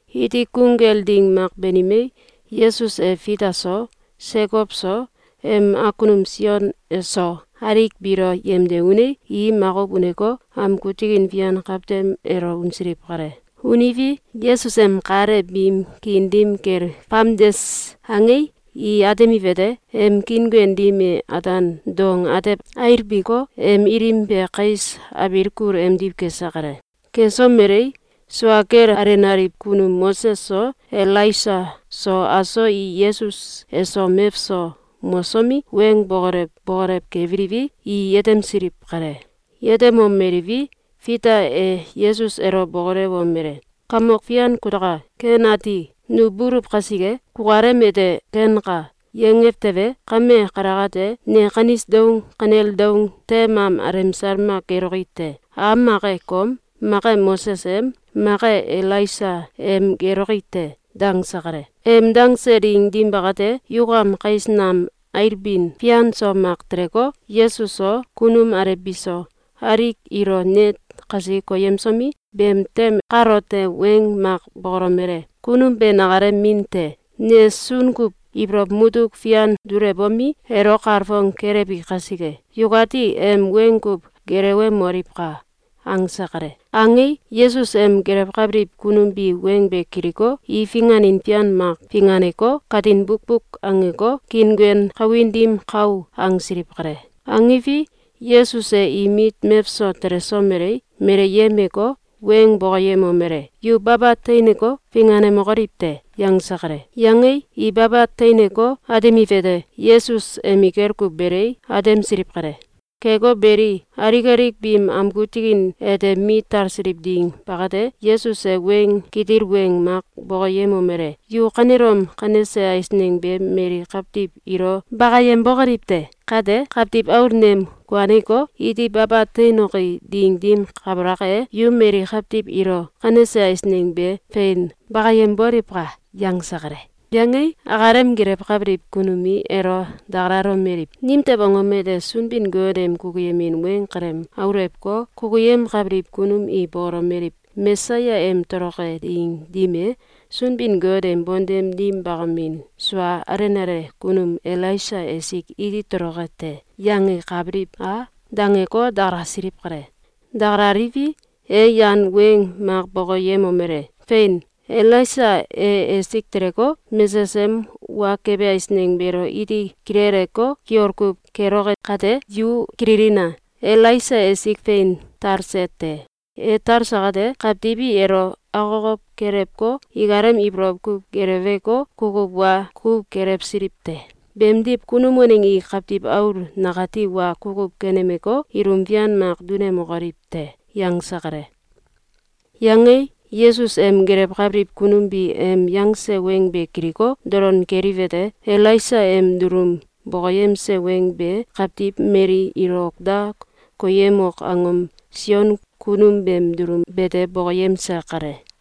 Iti gung kel ding mak banimei, Yesus e Fita so, Sekow so, em awkunum Sion so, alik biilo yemde unei, i makuw uneko, amgu tikin fian kawtem elo unsiliw kale. Uniwi, Yesus em kal e biim kiin dim kel famdes angei, i atemiwete: Em kiinguen dim e ataan dong atew ailbiko, em ilim be kais abiil kul emdiw kese kale. Kesomelei, sua kel alenaliw kunum Moses so Elaisa so aso i Yesus eso mewso mosomi, weng bokolew bokolew kebiliwi, i yetemsiliw kale. Yetemomeliwi, Fita e Yesus elo bokolewomele: “Kamok fian kutaka! Ken ati! Nu buluw kasike. Kukalem ete ‘Kenka!’, yangew tewe, kame kalakate, ne kanis doung kanel doung tem am alemsal mak geloki te! Am mak e kom, mak e Moses em, mak e Elaisa em geloki te.”, dangse kale. Em dangse ding dim bakate, yukam kais nam ailbin fian so mak teleko, Yesus so, kunum alew biso, alik ilo net kasi koyemsomi, beem tem kalote weng mak bokolomele: “Kunum be nakalem min te. Ne sun kuw ibolow mutuk fian dulewbomi, elo kalfong kelewbi kasike, yukati em weng kuw gelewemoliwka!”, angse kale. Angei, Yesus em gelewkabiliw kunum bi weng be kiliko, i finganin fian mak finganeko, katin bukbuk angeko, kiinguen kawin dim kau angsiliw kale. Angiwi, Yesus e im mit mewso telesomelei, meleyemeko, weng bokoyemomele: “Yu baba teineko, finganemokoliw te!”, yangse kale. Yangei, i baba teineko, atemiwete: Yesus emikel kuw belei, atemsiliw kale. Keko beli, alik alik biim amgu tikin ete mit tasiliw ding bakate, Yesus e weng kitil weng mak bokoyemomele: “Yu kanelom kanese eisneng be mali kawtiw ilo bakayem bokoliw te! Kate, Kawtiw Aul nem kuaneko, iti baba teinoki ding dim kabalak e, yu mali kawtiw ilo kanese eisneng be fein bakayem boliwka!”, yangse kale. Yangei, akalem gelewkabiliw kunum i elo dakalalomeliw: “Nimtew angom ete Sunbin-Got em kukuyemin weng kalem aulewko, kukuyemkabiliw kunum i bokolomeliw: ‘Mesaya em toloke ding dim e, Sunbin-Got em bontem dim bakamin sua alenale kunum Elaisa esik iti toloke te!’, yangekabiliw a?’, dangeko, dakalasiliw kale. Dakalaliwi, e yan weng mak bokoyemomele: “Fein! Elaisa e esik teleko, mesesem wa kebe eisneng beelo iti kileleko, kiol kuw keloke kate, yu kililina! Elaisa esik fein talse te. E talse kate, kawtiw i elo akokow kelewko, ikalem ibolow kuw geleweko, kukuw wa kuw kelewsiliw te. Beemdiw kunum waneng i Kawtiw Aul nakati wa kukuw kenemeko, ilum fian mak dunemokoliw te.”, yangse kale. Yangei, Yesus em gelewkabiliw kunum bi em yangse weng be kiliko, dolon keliwete: Elaisa em dulum bokoyemse weng be kawtiw mali ilo ok da koyemok angom Sion kunum beem dulum bete bokoyemse kale.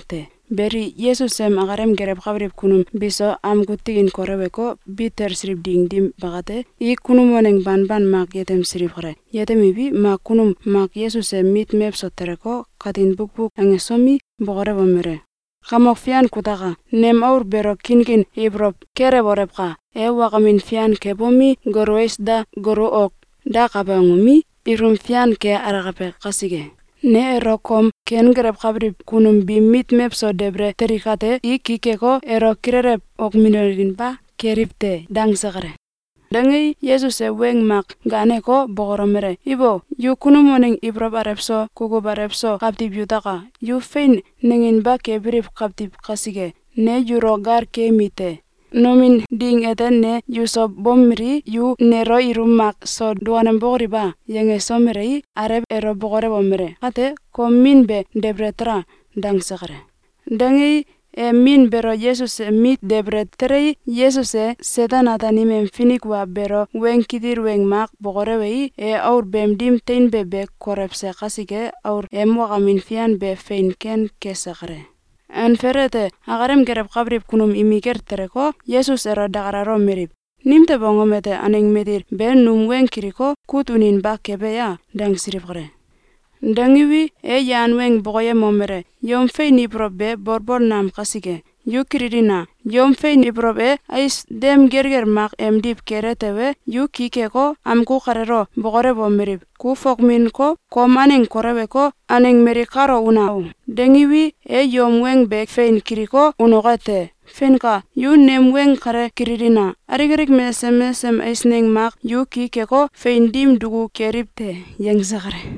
Beli, Yesus em akalem gelewkabiliw kunum biso amgu tikin koleweko, bit talsiliw ding dim bakate, i kunum waneng banban mak yetemsiliw kale. Yetemiwi, mak kunum mak Yesus em mit mewso teleko, katin bukbuk angesomi, bokolewomele: “Kamok Fian kutaka! Nem aul beelo kinkin ibolow kelewolewka! E wakamin fian kebomi, golu ais da, golu ok dakabe angomi, ilum fian ke alakabe kasike! Ne elo kom kenggelewkabiliw kunum biim mit mewso debele teli kate, i ki keko, elo kilelew okminolinba keliw te.”, dangse kale. Dangei, Yesus e weng mak gaaneko, bokolomele: “Ibo! Yu kunum waneng ibolow alew so, kukuw alew so kawtiw yutaka! Yu fein nanginba kebiliw kawtiw kasike, ne yulo gal keyemi te! Nomin ding ete ne yuso bomelii, yu nelo ilum mak so dukanembokoliw a?”, yangesomelei, alew elo bokolewomele: “Kate kom min be debele tala!”, dangse kale. Dangei, e min beelo Yesus em mit debele telei, Yesus e Seten-Ataanim em finik wa beelo weng kitil weng mak bokolewei, e aul beem dim teinbe be kolewse kasike, aul em wakamin fian be fein ken kese kale. Anfel ete, akalem gelewkabiliw kunum imikel teleko, Yesus elo dakalalomeliw: “Nimtew angom ete aneng matil be num weng kiliko, kut uninba kebe ya?”, dangsiliw kale. Dangiwi, e yan weng bokoyemomele: “Yom fein ibolow be bolbol nam kasike. Yu kililina! Yom fein ibolow e ais dem gelgel mak emdiw kele tewe, yu ki keko, amgu kaleelo bokolewomeliw: ‘Ku fokminko, kom aneng koleweko, aneng mali kalo una o!’, dangiwi, e yom weng be fein kiliko, unoke te. Feinka! Yu nem weng kale kililina! Alik alik mesesem mesesem eisneng mak yu ki keko, fein dim duku keliw te!”, yangse kale.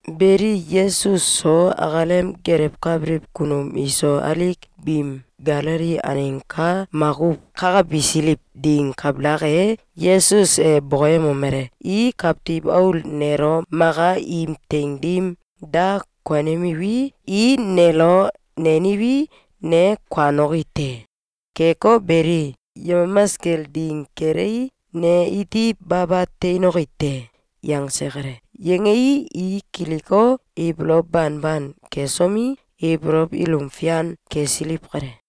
Beli, Yesus so akalem gelewkabiliw kunum iso alik biim Galili aneng ka makuw kakabisiliw ding kabalak e, Yesus e bokoyemomele: “I Kawtiw Aul nelo maka im teing dim da konemiwi, i nelo neniwi, ne kuanoki te. Keko beli, yemamas kel ding kelei, ne iti baba teinoki te.”, yangse kale. Yangei, i kiliko, ibolow banban kesomi, ibolow ilum fian kesiliw kale.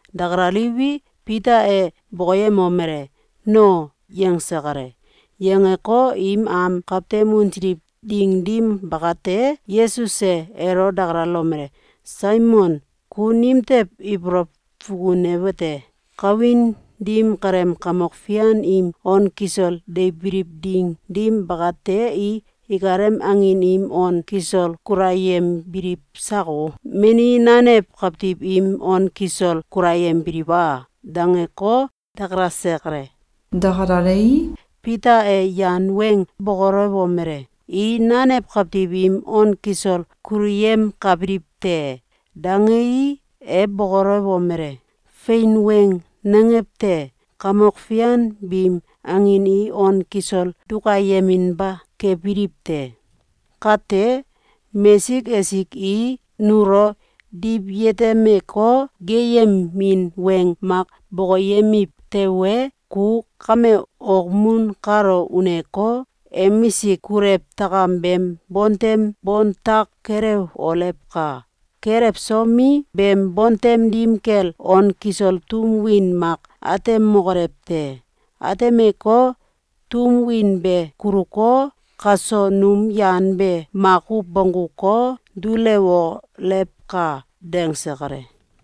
Dakalaliwi, Fita e bokoyemomele: “No.”, yangse kale. Yangeko, im am kawtem unsiliw ding dim bakate, Yesus e elo dakalalomele: “Saimon, ku nimtew ibolow fukunewete: Kawin dim kaleem kamok fian im on kisol deibiliw ding dim bakate, i ikalem angin im on kisol kulayembiliw sako? Meni nanew kawtiw im on kisol kulayembiliw a?”, dangeko, dakalase kale. Dakalalei, Fita e yan weng bokolewomele: “I nanew kawtiw im on kisol kuluyemkabiliw te!”, dangei, e bokolewomele: “Fein weng nangew te. Kamok fian biim angin i on kisol dukayeminba kebiliw te. Kate mesik esik i nulo diwyetemeko, geeyemin weng mak bokoyemiw tewe, ku kame okmun kalo uneko, emisik kulew takam beem bontem bontak kelewolewka! Kelewsomi, beem bontem dim kel on kisol tum win mak atemokolew te. Atemeko, tum win be kuluko, kaso num yan be makuw bongguko, dulewolewka!”, dangse kale.